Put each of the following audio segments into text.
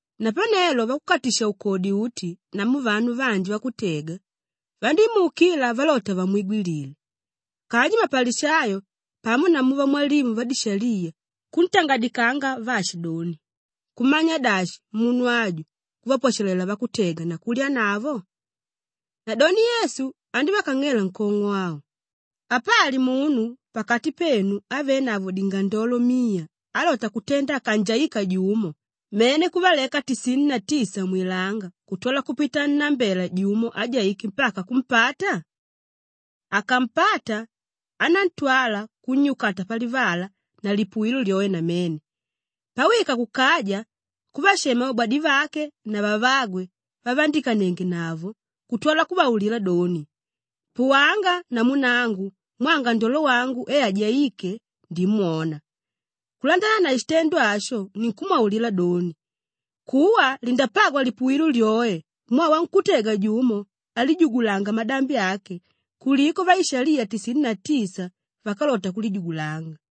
Napanelo vakukatisha-ukodi uti namu vanu vanji vakutega vandímuukila valota vamwigwilile. Kanji mapalishayo pamo namu vamwalimu vadishaliya kuntangadikanga vaashidoni, “Kumanya dashi, munu aju kuvapwashalela vakutega na kulyanavo!” Nadoni Yesu andívakang'ela nkong'o au, “Apali munu pakati penu ávenavo dingandolo miya álota kutenda akanjaika jumo mene kuvaleka tisini na tisa mwilanga kutwala kupita annambela jumo ájaike mpaka kumpata? Akampata, anantwala kunnyukata palivala na lipuwilo lyoe namene. Pawika kukaja kuvashema vabwadivake na vavagwe vavandikanengenavo kutwala kuvaulila doni, ‘Puwanga namu nangu mwaa ngandolo wangu e ajaíke, ndimwona.’ Kulandana na shitendo asho ninkumwaulila doni, kuwa lindapagwa lipuwilo lyoe mwaa wankútega jumo álijugulanga madambi ake kuliko vaishaliya tisini na tisa vákalota kulijugulanga.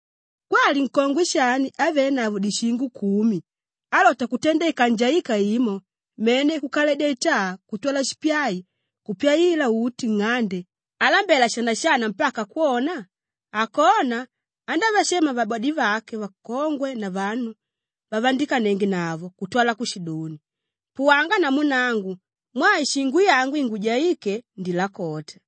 “Kwali nkongwe shani ávenavo dishingo kumi álota kutenda ikanjaika imo mene kukaledya itaa kutwala shipyai kupyaila uti nng'ande alambela shanashana mpaka kwona? Akona, andavashema vabwadivake vakongwe na vanu vavandikanengenavo kutwala kushidoni, ‘Puwanga namu nangu mwaa ishingo yangu ingujaíke, ndilakota.’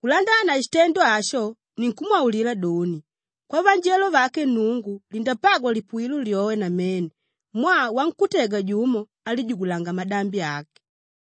Kulandana na shitendo asho ninkumwaulila doni, kwavanjelo vake Nnungu lindapagwa lipuwilo lyoe namene mwaa wankútega jumo álijugulanga madambi ake.”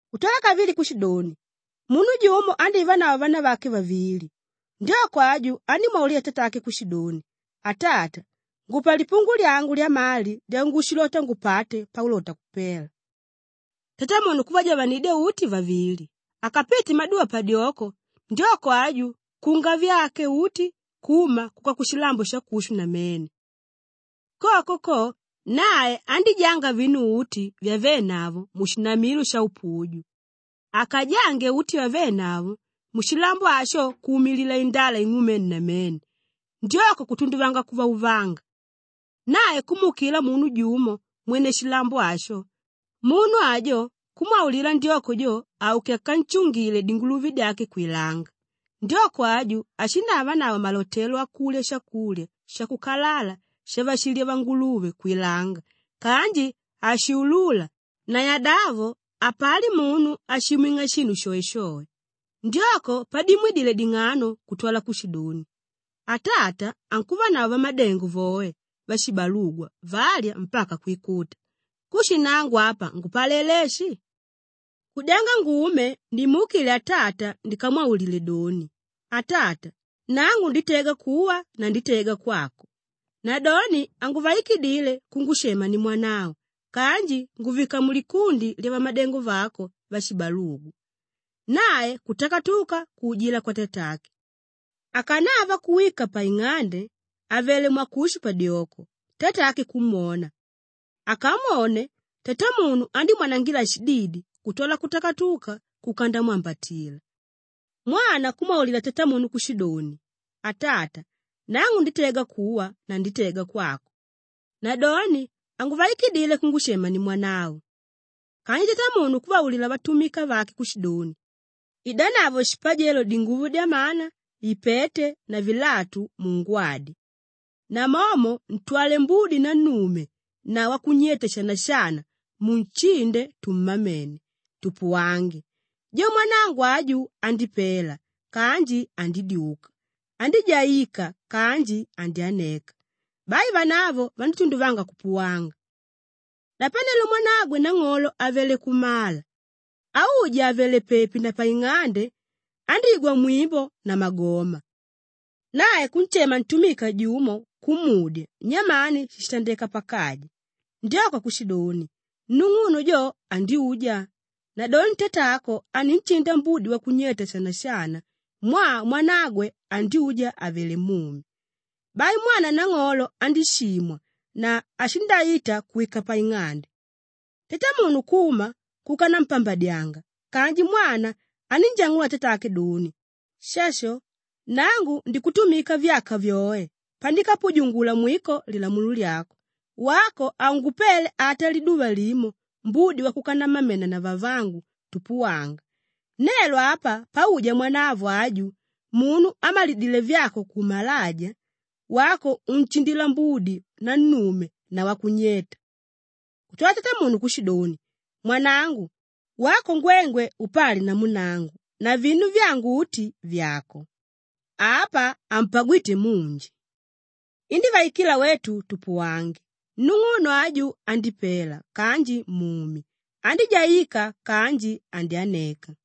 Kutwala kavili kushidoni, “Munu jumo andívanavo vanavake vavili. Ndyoko aju andímwaulila tatake kushidoni, ‘Atata, ngupa lipungu lyangu lyamali lyangushilota ngupate paulota kupela!’ Tatamunu kuvajavanidya uti vavili. Akapite maduva padyoko, ndyoko aju kukunga vyake uti kuma kuka kushilambo shakushu namene. Koko ko, nae andíjanga vinu uti vyavénavo mushinamilo shaupuju. Akajange uti vyavénavo, mushilambo asho kuumilila indala ing'umene namene, ndyoko kutunduvanga kuvauvanga. Nae kumuukila munu jumo mwene shilambo asho; munu ajo kumwaulila ndyoko jo auke akanshungile dinguluve dyake kwilanga. Ndyoko aju ashindavanavo malotelo akulya shakulya shakukalala shavashilya vanguluve kwilanga kanji hashuluula na yadavo hapali munu áshimwing'a shinu shoeshoe. Ndyoko padimwidile ding'ano kutwala kushidoni, ‘Atata ankuvanavo vamadengo voe vashibalugwa valya mpaka kwikuta; kushi nangu apa ngupalela eshi? Kudyanga ngume nimuukile atata ndikamwaulile doni, “Atata, nangu nditega kuwa na nditega kwako. Nadoni hanguvaikidile kungushema nimwanavo kanji nguvika mulikundi lyavamadengo vako vashibalugwa.” “Nae kutakatuka kuujila kwatatake. Akanava kuwika paing'ande àvele mwakushu padyoko, tatake kumwona. Akamwone, tatamunu andímwanangila shididi kutwala kutukuta kuka ndamwambatila. Mwana kumwaulila tatamunu kushidoni, ‘Atata, nangu nditega kuwa na nditega kwako. Nadoni hanguvaikidile kungushema nimwanavo.’ Kanji tatamunu kuvaulila vatumika vake kushidoni, ‘Idanavo shipajelo dinguvo dyamana, ipete na vilatu mungwadye. Namomo ntwale mbudi nannume na wakunyeta shanashana munshinde tummamene, tupuwange; jo mwanangu aju, andípela kanji andídyuka, andíjaika kanji andyaneka.’ Bai vanavo vandítunduvanga kupuwanga. “Napanelo mwanagwe nang'olo avele kumala. Auja àvele pepi na paing'ande, andígwa mwimbo na magoma. Nae kunshema ntumika jumo kumudya nyamani shíshitandeka pakaja. Ndyoko kushidoni, ‘Nung'uno jo, andyuja. Nadoni tatako aninshinda mbudi wakunyeta shanashana mwaa mwanagwe andyuja àvele mumi.’ Bai mwana nang'olo andíshimwa na hashindaita kuwika paing'ande. Tatamunu kuma kuka nampambadyanga kanji mwana anínjang'ula tatake doni, ‘Shasho! Nangu ndikutumika vyaka vyoe pandikapujungula mwiko lilamulo lyako, wako haungupele ata liduva limo mbudi wakuka nammamena na vavangu tupuwanga. Nelo apa pauja mwanavo aju, munu ámalilidile vyako kumalaja, wako unshindila mbudi nannume na wakunyeta!’ Kutwala tatamunu kushidoni, ‘Mwanangu! Wako ngwengwe upali namu nangu na vinu vyangu uti, vyàko. Apa, hampagwite munji! Indívaikila wetu tupuwange; nung'uno aju, andípela kanji mumi, andíjaika kanji andyaneka.’”